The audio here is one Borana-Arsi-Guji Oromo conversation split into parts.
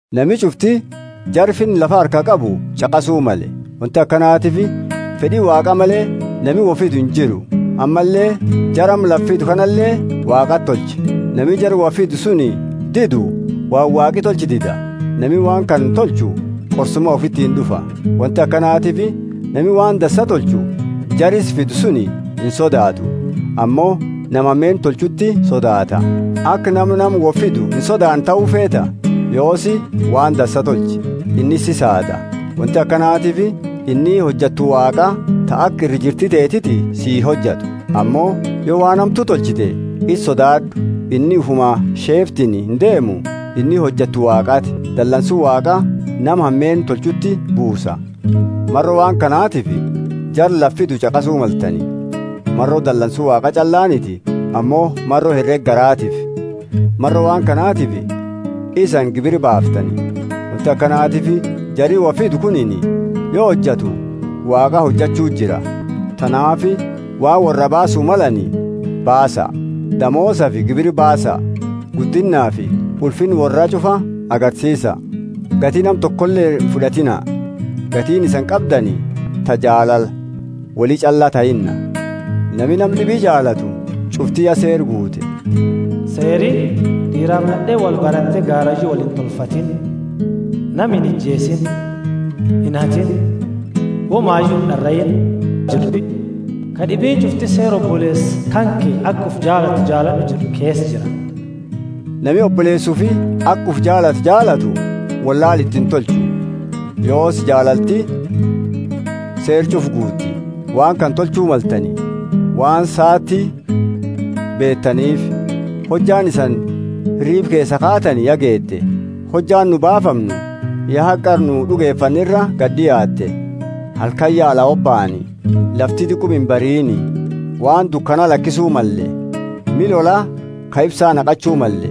Nami ch'ufti jara finna lafa harkaa qabu ch'aqasu malle; wonti akanatiifi fed'i Waaqa male nami wo fidu injiru, ammalle jara amma lafa fidu kanale Waaqati tolche. Nami jara wo fidu suni didu waan Waaqi tolche dida; nami waan kana tolchu qorsuma ufitiini d'ufa. Wonti akanatiifi nami waan dansa tolchu jara isa fidu suni insodaatu ammo nama hameenna tolchuuti sodaata. Aka nama nama wo fidu insodaanne tahu feeta? Yoosi waan dansa tolchi, inni si saada. Wonti akanatiifi inni hojattu Waaqaa ta aka ira jirti tanteti sii hojattu. Ammo yo waan hamtu tolchite isaa sodaad'u inni ufuma sheeftini indeemu. inni hojattu Waaqaati, dalansu Waaqa nama hameenna tolchuuti buusa. Maro waan kanatifi jara lafa fidu ch'aqasu maltani — maro dalansu Waaqa ch'allaaniti ammo maro herega garaatiifi. Maro waan kanatifi isani gibira baaftani; wonti akanatiifi jari wo fidu kunini, yo hojatu, Waaqaa hojachu jira. Tanaafi waan worraa baasu malani baasa; damoosafi gibira baasa, guddinnaafi ulfinna worra ch'ufa agarsiisa. Gati nama tokole imfud'atiina, gatiini isani qabdani ta jaalala woli ch'alla tahinna. Nami nama d'ibi jaalatu ch'ufti ya seera guute. Seeri, d'iirafi nad'eeni wolbarate garayu woliintolfatini: Nami inijeesiini; inhatiini; womayu ind'araiini jed'ufi ka d'ibiini ch'ufti seera oboleesa kanke aka ufi jaalatu jaalad'u jed'u keesa jira. Nami oboleesa ufi aka ufi jaalatu jaalatu wollaala iti intolchu. Yoosi, jaalalti seera ch'ufa guuti. Waan kana tolchu maltani, waan saati beetaniifi: hojjaani isani hiriiba keesaa kaatani ya geete. Hojjaani nu baafamnu ya haga qara nu d'ugefanne ira gadi d'iaatte. Halkani ya ala hobaani, lafti diquma imbariini. Waan dukana lakisu malle. Miha lola ka ifsa naqachu malle.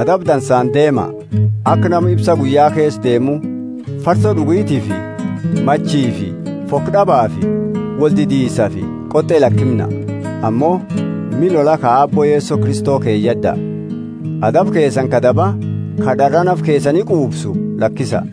Adaba dansaani deema, aka nama ifsa guyya keesa deemu. farso d'ugitiifi machifi, foko d'abaafi woldidiisafi qot'e lakimna. Ammo miha lola ka Aabbo Yeso Kristo keyad'a, adaba keesani ka daba, ka d'araa nafa keesani quufsu lakisa.